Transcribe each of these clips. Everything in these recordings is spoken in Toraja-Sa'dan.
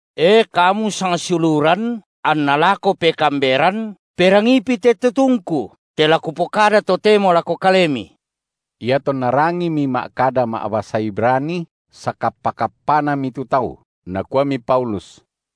E kamu sangsiuluran anna lako pekaamberan, perangiipi te tutungku, te la kupokada totemo lako kalemi! Iatonna rangimi ma’kada ma’basa Ibrani, sakappa-kappanami tu tau. Nakuami Paulus: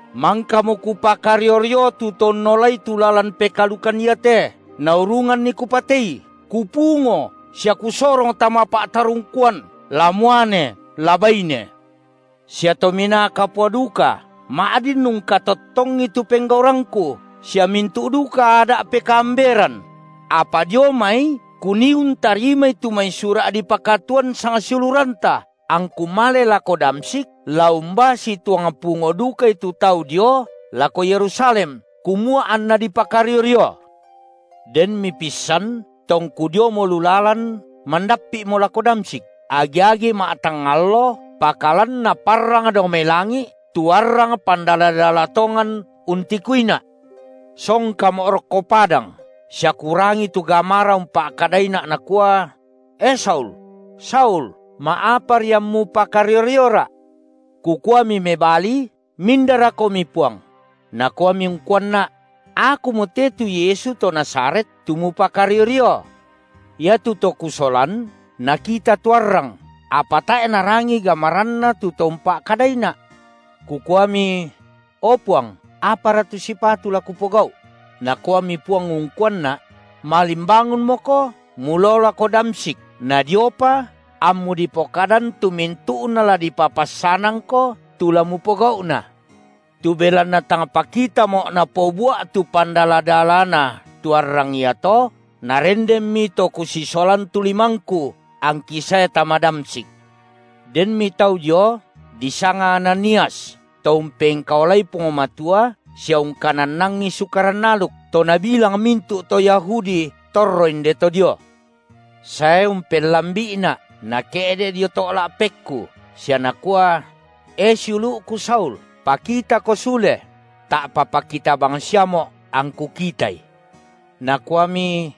Mangkamo kupakario-rio tu to unnolai tu lalan pekaalukan iate naurunganni kupatei, kupungo sia kusorong tama pa’tarungkuan la muane la baine. Sia Tominaa Kapua duka ma’din ungkatottongi tu penggaurangku, sia mintu’ duka Ada’ pekaamberan; apa dio mai kunii untarimai tu mai sura’ dipakatuan sang siuluranta, angku male lako Damsyik, la umbaa situang pungo dukai tu tau dio lako Yerusalem, kumua anna dipakario-rio. Denmi pissan, tongku diomo lu lalan, mandappi’mo lako Damsyik, agi-agi ma’tangnga allo, pakalan naparrangmo dao mai langi’ tu arrang pandala-dala tongan untikuina’. Songkamo’ rokko padang sia kurangi tu gamara umpa’kadaina’ nakua: E Saul, Saul, ma’apari ammu pakario-rioRa’? Kukuami mebali: MindaroKomi, Puang? Nakuami ungkuanna’: Akumo te tu Yesu to Nazaret tu mupakario-rio. Iatu to kusolan nakita tu arrang, apa tae’ narangii gamaranNa tu To umpa’kadaina’. Kukuami: O Puang, apara tu sipatu la kupogau’? Nakuami Puang ungkuanna’: Malimbangunmoko mulao lako Damsyik nadiopa ammu dipokadan tu mintu’na la dipapassanangko tu la mupogau’na. Tu belanna tang pakitamo’ napobua’ tu pandala-dalana tu arrang iato, narendenmi to kusisolan tu limangku angki sae tama Damsyik. Denmi tau dio disanga Ananias to umpengkaolai Puang Matua sia ungkanannangi Sukaran aluk, to nabilang mintu’ to Yahudi torro inde to dio, sae umpellambi’ina’ nake’de’ dio to’ la’pekku sia nakua: E siulu’ku Saul, pakitako sule! Ta’pa pakita bangsiamo’ angku kitai. Nakuami: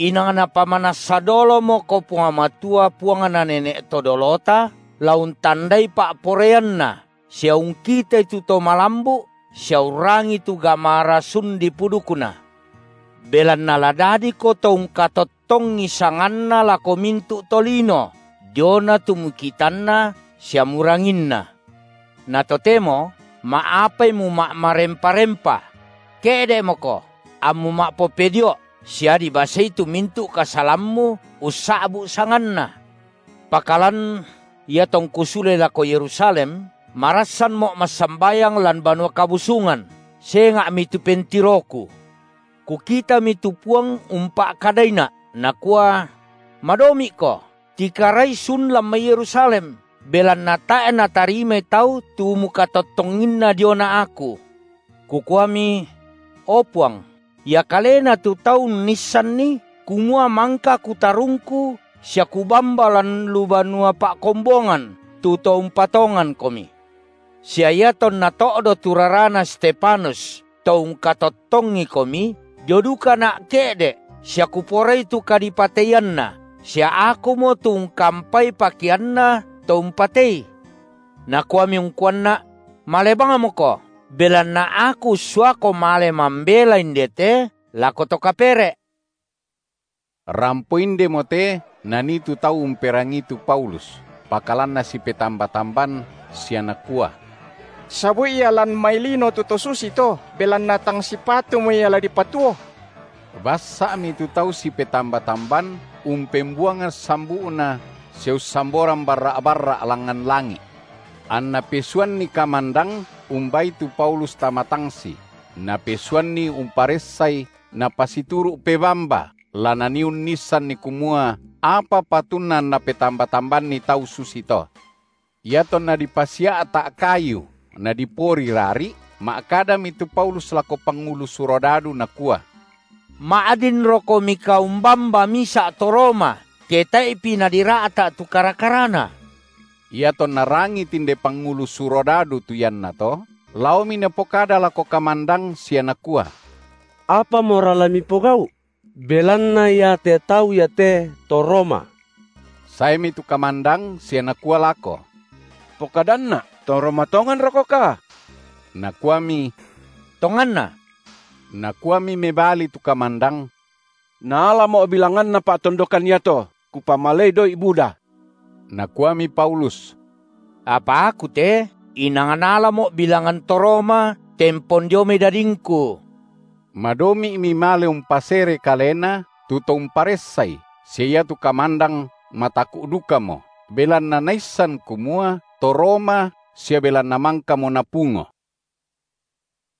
Inang napamanassa dolomoko Puang Matua Puangna nene’ to dolota la untandai pa’poraianNa sia ungkitai tu To malambu’ sia urrangii tu gamara sun dipudukNa. Belanna la dadiko to ungkatottongi sanganNa lako mintu’ tolino diona tu mukitanna sia muranginna. Na totemo, ma’apai muma’marempa-rempa? Ke’de’moko, ammu ma’popedio’ sia dibasei tu mintu’ kasalammu ussa’bu’ sanganNa. Pakalan iatongku sule lako Yerusalem, marassanmo’ massambayang lan Banua Kabusungan senga’mi tu pentiroku; kukitami tu Puang umpa’kadaina’ Nakua: Madomi’ko, tikarai sun lan mai Yerusalem, belanna tae’ natarimai tau tu mukatottonginna diona Aku. Kukuami: O Puang, ia kalena tu tau unnissanni kumua mangka kutarungku sia kubamba lan lu banua pa’kombongan tu to umpatonganKomi. Sia iatonna to’do tu rarana Stefanus, to ungkatottongiKomi, dio dukana’ ke’de’ sia kuporai tu kadipateianna sia akumo tu ungkampai pakeanna to umpatei. Nakuami ungkuanna’: Male bangmoko, belanna Aku ussuako male mambela indete lako to kapere’. Rampo indemote nanii tu tau umperangii tu Paulus, pakalan nasipetamba-tamban sia nakua: Sabu’i ia lan mai lino tu to susito, belanna tang sipatumo la dipatuo. Bassa’mi tu tau sipetamba-tamban umpembuangan sambu’na sia ussamboran barra’-barra’ langngan langi’, anna pesuanni kamandang umbaai tu Paulus tama tangsi, napesuanni umparessai napasituru’ pebamba la nanii uniissanni kumua apa patunna anna petamba-tambanni tau susito. Iatonna dipasia’ta’ kayu nadipori rari’, ma’kadami tu Paulus lako pangulu surodadu nakua: Ma’dinrokomika, umbamba misa’ to Roma ke tae’pi nadira’ta’ tu kara-karana? Iatonna rangii tinde pangulu surodadu tu iannato, laomi napokada lako kamandang sia nakua: Apamora la mipogau’? belanna iate tau iate to Roma. Saemi tu kamandang sia nakua lako: Pokadanna’, to Roma tonganrokoka? Nakuami: Tonganna. Nakuami mebali tu kamandang: Naalamo’ bilangan pa’tondokan iato, kupamalei doi’ buda. Nakuami Paulus: Apa aku te inang naalamo’ bilangan to Roma tempon dio mai dadingku. Madomi’mi male umpasere kalena tu to umparessai sia iatu kamandang mataku’ dukamo, belanna naissan kumua to Roma sia belanna mangkamo napungo.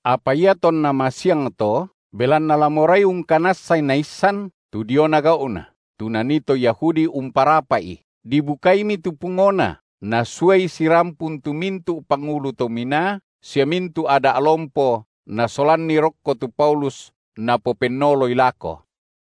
Apa iatonna masiangto, belanna la morai ungkanassai naissan tu diona gau’na, tu nanii to Yahudi umparapa’i, dibukaimi tu pungona, nasuai sirampun tu mintu’ pangulu to minaa sia mintu’ Ada’ lompo, nasolanni rokko tu Paulus napopennoloi lako.